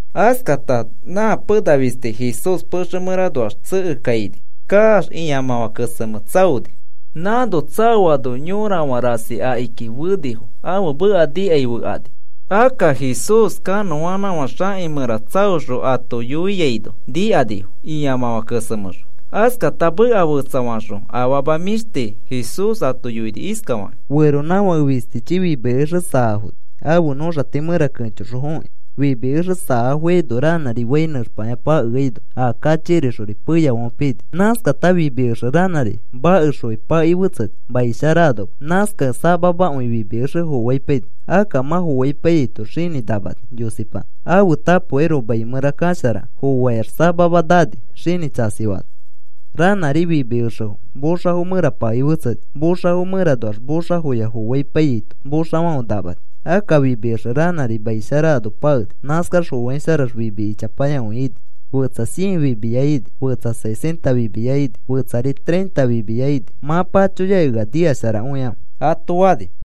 Askata na pena fisti Jesús pexe mẽranoax tsekekaini kaax, ĩamãfã kesemẽ tsaoni. Nãno tsaoano yorafã rasi akiki fenifo, ãfe meka nikai fekani. Akka Jesús kanõanãfã xaki mẽra tsaoxõ ato yoiaino nikanifo, ĩamãfã kesemẽxõ. Askata meka fetsafaxõ afama mĩshti Jesús ato yoini iskafakĩ: “Feronãfake fistichi fimi exe saafoni ãfe nõxati mẽra kẽchoxõ fokĩ. Fimi exe saafoikaino ranãri fai nẽxpakĩa pakeaino a kachikirixori peyafãfe pini. Nãskata fimi exe ranãri makexfoki pakei fetseni mai shara anoma. Nãskakẽ samamakõi fimi exe foaipaini. Akka mã foaipaiyaito xinĩ namani, yosipanã, ãfe tapokairoko mai mẽra kasharakẽ. Foaikax, samama nani xinĩ tsasifaano. Ranãri fimi exefo moxafo mẽra pakei fetseni. Moxafo mẽranoax moxafoya foaipaiyaito moxafãfe namani. Akka fimi exe ranãri mai shara ano pakeni. Nãskax foaisharax fimi ichapayakõi ini. Fetsa cien fimiya ini, fetsari sesenta fimiya ini, fetsari treinta fimiya ini. Mã pachoyakĩ ea nikasharakõikãfe,” ato fani.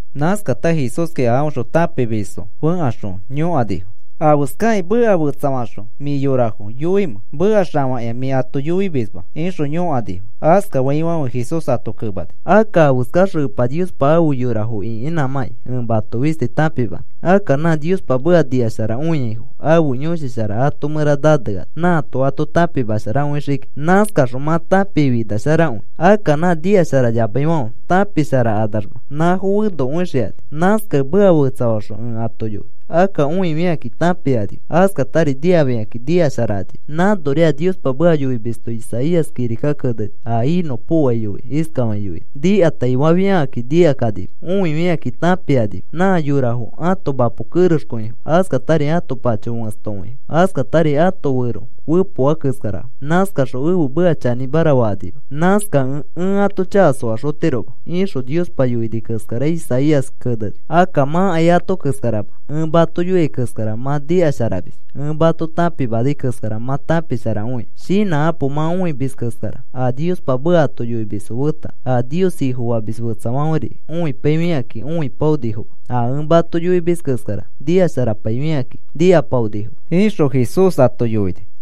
Nãskata Jesúski a aõxõ tãpimisfo fẽkaxõ yõkanifo: “¿Afeskakĩ meka fetsafaxõ mĩ yorafo yoimẽ? Meka xafakĩa mĩ ato yoimisma,” ixõ yõkanifo. Askafaifãfe Jesús ato kemani: “Akka afeskaxõ Epa Niospa afe yorafo ĩkinãmakĩ ẽ mato fisti tãpimanõ. Akka nã Niospa meka nikasharakõiaifo ãfe Yõshi Shara ãto mẽra naneano nãato ato tãpimasharakõixii kiki. Nãskaxõ mã tãpikĩ finasharakõi. Akka nã nikasharayamaifãfe tãpisharakanamax nãfo fenokõixikani. Nãskakẽ meka fetsafaxõ ẽ ato yoi. Akka õifikakĩ tãpikanima. Askatari nikafikakĩ nikasharakanima. Nãnori a Niospa meka yoimisto Isaías kirika keneni a inõpokoai yoikĩ. Iskafakĩ yoini: Nikataifafiafikakĩ nikakanima. Õifikakĩ tãpikanima. Nã yorafo ãto mapo kerexkõifo. Askatari ãto pacho fẽstokõifo. Askatari ãto fero fepoa keskarafo. Nãskaxõ ẽfe meka chanĩmara fakanima. Nãskakẽ ẽ ãto chaka soaxotiroma, ixõ Niospa yoini keskara Isaías kirika keneni. “Akka mãkai ato keskarama. Ẽ mato yoia keskara mã nikasharamis. Ẽ mato tãpimanai keskara mã tãpisharakõia. Shinãkapo. Mã õimis keskara a Niospa meka ato yoimisfo feta a Nios Ifofamis fetsafãferi õipaifikakĩ õipaonifoma. A ẽ mato yoimis keskara nikasharapaifikakĩ nikapaonifoma,” ixõ Jesús ato yoini.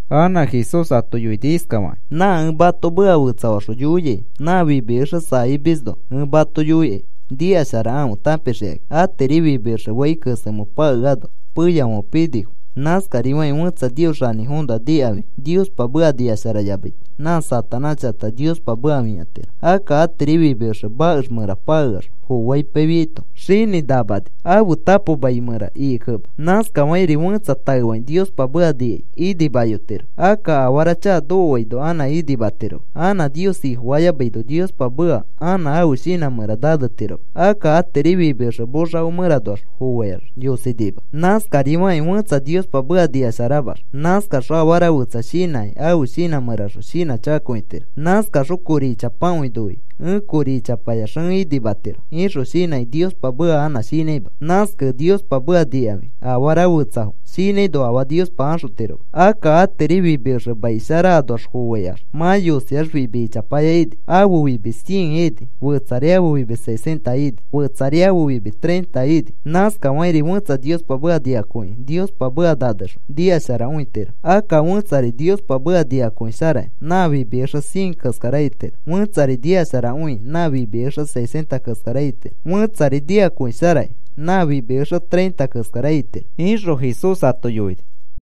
Anã Jesús ato yoini iskafakĩ: “Nã ẽ mato meka fetsafaxõ yoiai nã fimi exe saamisfoõnoa ẽ mato yoikai. Nikasharakãfe tãpixikakĩ. Atiri fimi exe fai kesemẽ pakeaino peyafãfe pinifo. Nãskafakĩri fẽtsa Nios Xanĩfoõnoa nikafikĩ Niospa meka nikasharayamaito, nã Satanás chakata Niospa meka fĩatiro. Akka atiri fimi exe makex mẽra pakeax, foaipaifiaito xinĩ namani, ãfe tapo mai mẽra ikikẽma. Nãskafakĩri fẽtsa taefakĩ Niospa meka nikai inimayotiro. Akka afara chaka nokoaino anã inimatiroma, anã Nios Ifofayamaino Niospa meka anã ãfe shinã mẽra nanetiroma. Akka atiri fimi exe moxafo mẽranoax foaikax yosinima. Nãskari fakĩ fẽtsa Niospa meka nikasharamax, nãskaxõ afara fetsa shinãkĩ, ãfe shinã mẽraxõ shinãchakakõitiro. Nãskaxõ kori ichapakõi noikĩ, ‘Ẽ kori ichapayax ẽ inimatiro,’ ixõ shinãkĩ Niospa meka anã shinãima. Nãskakẽ Niospa meka nikafikĩ afara fetsafo shinãino, afaa Niospa axotiroma. Akka atiri fimi exe mai shara anoax foaikax mã yosiax fimi ichapaya ini, ãfe fimi cien ini, fetsari ãfe fimi sesenta ini, fetsari ãfe fimi treinta ini. Nãskafakĩri fẽtsa Niospa meka nikakõikĩ Niospa meka nanexõ nikasharakõitiro. Akka fẽtsa Niospa meka nikakõisharakĩ nã fimi exe cien keskara itiro, fẽtsari nikasharakõi nã fimi exe sesenta keskara itiro, fẽtsari nikakõisharakĩ nã fimi exe treinta keskara itiro,” ixõ Jesús ato yoini.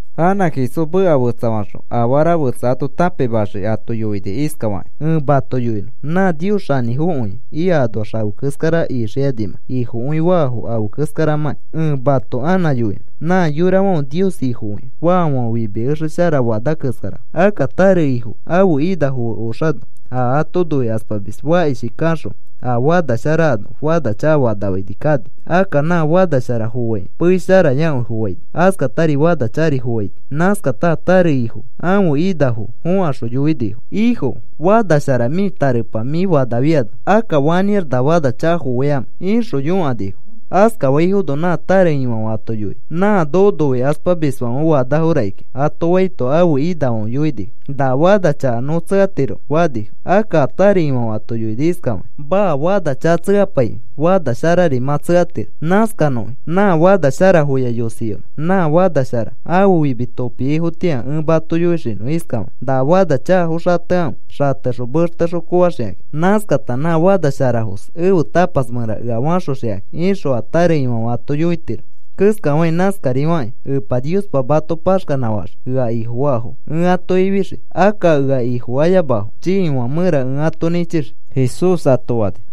Anã Jesús meka fetsafaxõ afara fetsa ato tãpimaxii ato yoini iskafakĩ: “Ẽ mato yoinõ nã Nios xanĩfokõi ika anoax afe keskara ixikanimãkai. Ifokõi faafo afe keskaramãkĩ ẽ mato anã yoinõ. Nã yorafãfe Nios Ifokõi faafãfe fimi exe shara fana keskarafo. Akka tare ifo ãfe inafo fe oxano, a ato noikaspamis fakishi kaxõ a fana shara ano fana chakafanafaini kani. Akka nã fana shara foaikĩ pei sharayakõi foaini. Askatari fana chakari foaini. Nãskata a tare ifoki ãfe inafo fokaxõ yoinifo: ‘Ifo, fana shara mĩ tarepa mĩ fanafiano, akka, ¿fanĩax na fana chaka foaikamẽ?’ ixõ yõkanifo. “Askafaifono nã tare ifãfe ato yoini: ‘Nã noko noikaspamisfãfe fanafo rakikĩa,’ ato faito ãfe inafãfe yoinifo: ‘¿Na fana chaka nõ tsekatiromẽ?’ fanifo. Akka a tare ifãfe ato yoini iskafakĩ: ‘Maa, fana chaka tsekapaikĩ fana sharari mã tsekatiro. Nãskanõki. Nã fana sharafoya yosiyonõ nã fana shara ãfe fimi topiaifotĩa, ẽ mato yoixinõ iskafakĩ: “Na fana chakafo xatekãfe. Xatexõ mextexõ koaxikaki. Nãskata nã fana sharafos ẽfe tapas mẽra ea faxoxikakĩ,” ’ ixõ a tare ifãfe ato yoitiro keskafakĩ, nãskarifakĩ Epa Niospa mato paxkanãfaxii ea Ifofaafo ẽ ato ifixii. Akka ea Ifofayamafo chiifã mẽra ẽ ato nĩchixii,” Jesús ato fani.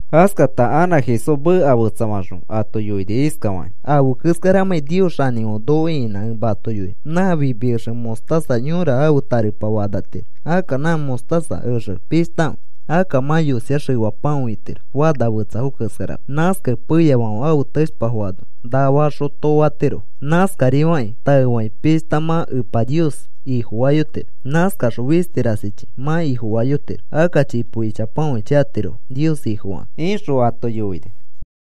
Askata anã Jesús meka fetsafaxõ ato yoini iskafakĩ: “Afe keskaramãkĩ Nios xanĩfãfe noko ĩkinã ẽ mato yoinõ. Nã fimi exe mostaza yõra ãfe tarepa fanatiro. Akka nã mostaza exe pishtakõi. Akka mã yosiax efapakõi itiro fana fetsafo keskarama. Nãskakẽ peyafãfe ãfe teshpafo ano naa faxõ too fatiro. Nãskari fakĩ taefakĩ pishta mã Epa Nios Ifofayotiro. Nãskaxõ fisti rasichi mã Ifofayotiro. Akka chipo ichapakõichi atirofo Nios Ifofakakĩ,” ixõ ato yoini.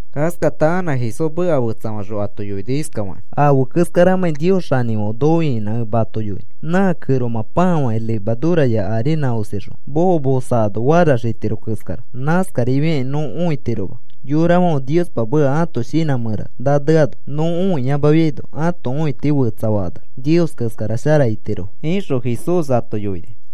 Askata anã Jesús meka fetsafaxõ ato yoini iskafakĩ: “Afe keskaramãkĩ Nios xanĩfãfe noko ĩkinã ẽ mato yoinõ. Nã kẽromã pãa fakĩ levaduraya arinã osixõ kamosakano faraxitiro keskara. Nãskarifiakĩ nõ õitiroma. Yorafãfe Niospa meka ãto shinã mẽra naneano nõ õiyamafiaino ãto õiti fetsafakanax Nios keskara shara itirofo,” ixõ Jesús ato yoini.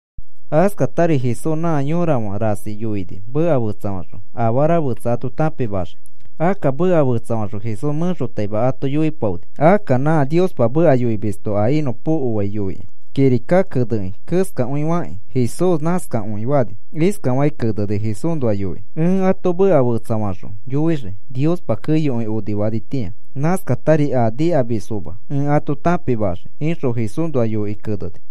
Askatari Jesús nã yorafã rasi yoini meka fetsafaxõ afara fetsa ato tãpimaxii. Akka meka fetsafaxõ Jesús mẽxotaima ato yoipaoni. Akka nã Niospa meka yoimisto a inõpokoai yoikĩ kirika kenekĩ keskakõifakĩ Jesús nãskakõi fani. Iskafakĩ keneni Jesúsnoa yoikĩ: Ẽ ato meka fetsafaxõ yoixii. Niospa keyokõi onifanitĩa nãskatari a nikamisfoma ẽ ato tãpimaxii, ixõ Jesúsnoa yoikĩ keneni.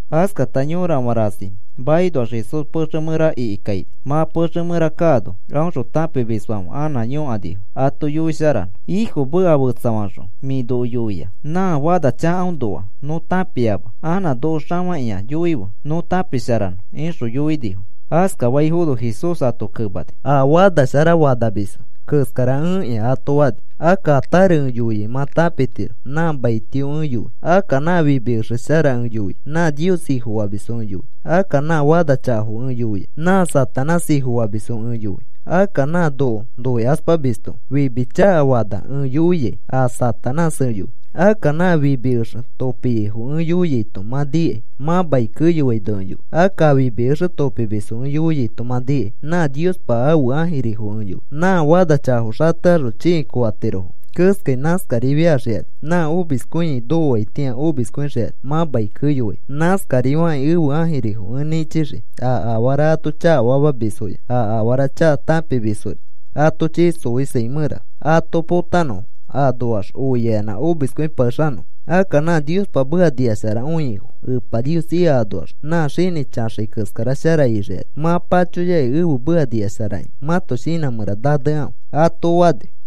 Askata yorafã rasi makinoax Jesús pexe mẽra ikikaini. Mã pexe mẽra kaano, aõxõ tãpimisfãfe anã yõkanifo ato yoisharanõ. “Ifo, meka fetsafaxõ mĩ noko yoia nã fana chakaõnoa nõ tãpiama. Anã noko xafakĩa yoife nõ tãpisharanõ,” ixõ yoinifo. Askafaifono Jesús ato kemani: “A fana shara fanamisfo keskara ẽkĩa,” ato fani. “Akka a tare ẽ yoiai mã tãpitiro nã maitio ẽ yoi. Akka nã fimi exe shara ẽ yoiai nã Nios Ifofamisfo ẽ yoi. Akka nã fana chakafo ẽ yoiai nã Satanás ifofamisfo ẽ yoi. Akka nã noko noikaspamisto fimi chakafana ẽ yoiai, a Satanás ẽ yoi. Akka nã fimi exe topiaifo ẽ yoiaito mã nikai, mã mai keyoaino ẽ yoi. Akka a fimi exe topimisfo ẽ yoiaito mã nikai, nã Niospa ãfe ãjirifo ẽ yoi. Nã fana chakafo xatekaxõ chĩi koatirofo keskai, nãskarifiaxikani nã omiskõiai nokoaitĩa omiskõixikani mã mai keyoaino. Nãskarifakĩ ẽfe ãjirifo ẽ nĩchixii a afara ato chakafamamisfoya a afara chaka tãpimisfori ato chii xoisai mẽra ato potanõfo anoax oiayanã omiskõipakexanõfo. Akka nã Niospa meka nikasharakõiaifo, Epa Nios ika anoax nã xinĩ chaxai keskara shara ixikani. Mã pachoyakĩ ẽfe meka nikasharakĩ mãto shinã mẽra nanekãfe,” ato fani.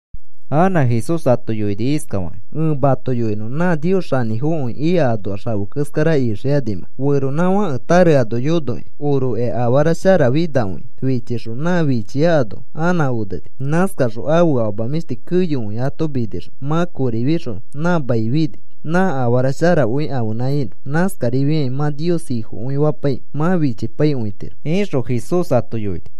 Anã Jesús ato yoini iskafakĩ: “Ẽ mato yoinõ nã Nios xanĩfokõi ika anoax afe keskara ixikanimãkai. Feronãfãke tare ano yonokĩ orokĩ afara sharafinakõia fichixõ nã fichia ano anã oneni. Nãskaxõ ãfe afama mĩshti keyokõi ato minixõ mã kori fixõ nã mai fini nã afara sharakõi ãfenã inõ. Nãskarifiakĩ mã Nios Ifokõifapaikĩ mã fichikõipaitiro,” ixõ Jesús ato yoini.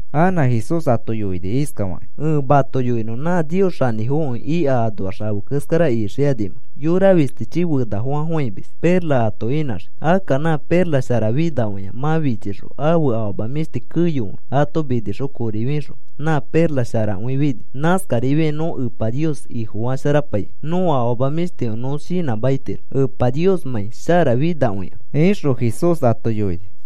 Anã Jesús ato yoini iskafakĩ: “Ẽ mato yoinõ nã Nios xanĩfokõi ika anoax afe keskara ixikanimãkai. Yora fistichi fenafofãfofãimis perla ato inãxii. Akka nã perla sharafinakõia mã fichixõ ãfe afama mĩshti keyokõi ato minixõ kori fixõ nã perla sharakõi fini. Nãskarifiakĩ nõ Epa Nios Ifofasharapaikĩ nõko afama mĩshtifo nõ shinãmakitiro Epa Niosmãi sharafinakõikẽ,” ixõ Jesús ato yoini.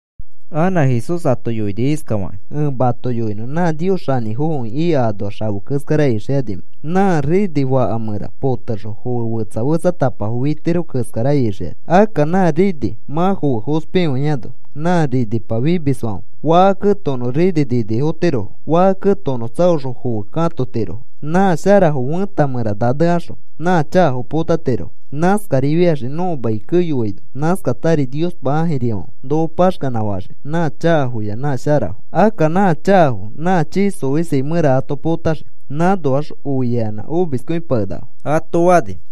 Anã Jesús ato yoini iskafakĩ: “Ẽ mato yoinõ nã Nios xanĩfokõi ika anoax afe keskara ixikanimãkai. Nã rini faka mẽra potexõ foe fetsa fetsatapafo fitirofo keskara ixikani. Akka nã rini mã foe fospikõiano, nã rinipa fimisfãfe faka ketokonõ rini ninifotirofo. Faka ketokonõ tsaoxõ foefo katotirofo. Nã sharafo fẽta mẽra nanekaxõ nã chakafo potatirofo. Nãskarifiaxii nõko mai keyoaino. Nãskatari Niospa ãfe ãjirifãfe noko paxkanã faxii nã chakafoya nã sharafo. Akka nã chakafo nã chii xoisai mẽra ato potaxii. Nãnoax oiayanã omiskõipakenakafo,” ato fani.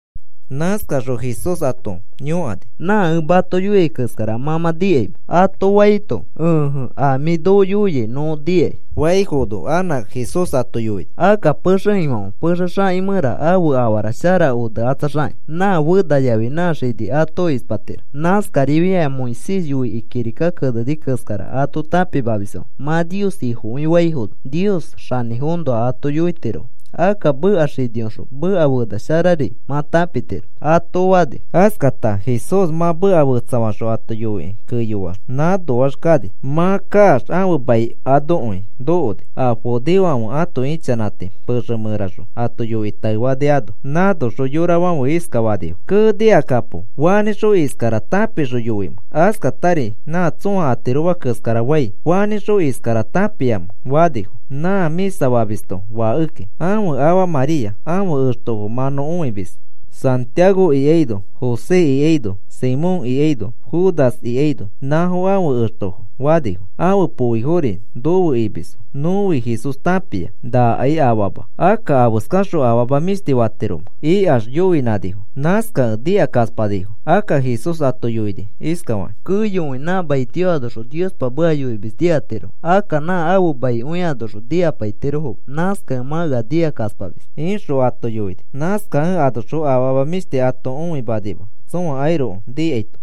Nãskaxõ Jesús ato yõkani: “¿Nã ẽ mato yoiai keskara mã mã nikaimẽ?” ato faito, “Ẽje, a mĩ noko yoiai nõ nikai,” faifono anã Jesús ato yoini: “Akka pexe ifãfe pexe xaki mẽra ãfe afara shara onekatsaxakĩ nã fena yafi nã xini ato ispatiro. Nãskarifiakĩ a Moisés yoikĩ kirika keneni keskara ato tãpimamisfãfe mã Nios Ifokõi faifono, Nios xanĩfoõnoa ato yoitirofo. Akka meka xiniõxõ meka fena sharari mã tãpitiro,” ato fani. Askata Jesús mã meka fetsafaxõ ato yoikĩ keyoax nãnoax kani. Mã kaax ãfe mai anokõi nokoni. A judeofãfe ãto ichanãti pexe mẽraxõ ato yoikĩ taefani ano. Nãnoxõ yorafãfe iskafanifo: “¡Kee, nikakapo! ¿Fanĩxõ iskara tãpixõ yoimẽ askatari nã tsõa atiroma keskara fai? ¿Fanĩxõ iskara tãpiamẽ?” fanifo. “Nã mĩsa famisto fakeki. Ãfe afa María. Ãfe extofo mã nõ õimis. Santiago ikaino, José ikaino, Simón ikaino, Judas ikaino, nãfo ãfe extofo,” fanifo. “Ãfe poifori nofe imisfo. Nõfi Jesús tãpia. Nãkai afama. Akka, ¿afeskaxõ afama mĩshti fatiromẽ?” ikax yoinãnifo. Nãskakẽ nikakaspanifo. Akka Jesús ato yoini iskafakĩ: “Keyokõi nã maitio anoxõ Niospa meka yoimis nikatirofo. Akka nã ãfe maikõi anoxõ nikapaitirofoma. Nãskakẽ mã ea nikakaspamis,” ixõ ato yoini. Nãskakẽ anoxõ afama mĩshti ato õimanima tsõakairoko nikaito.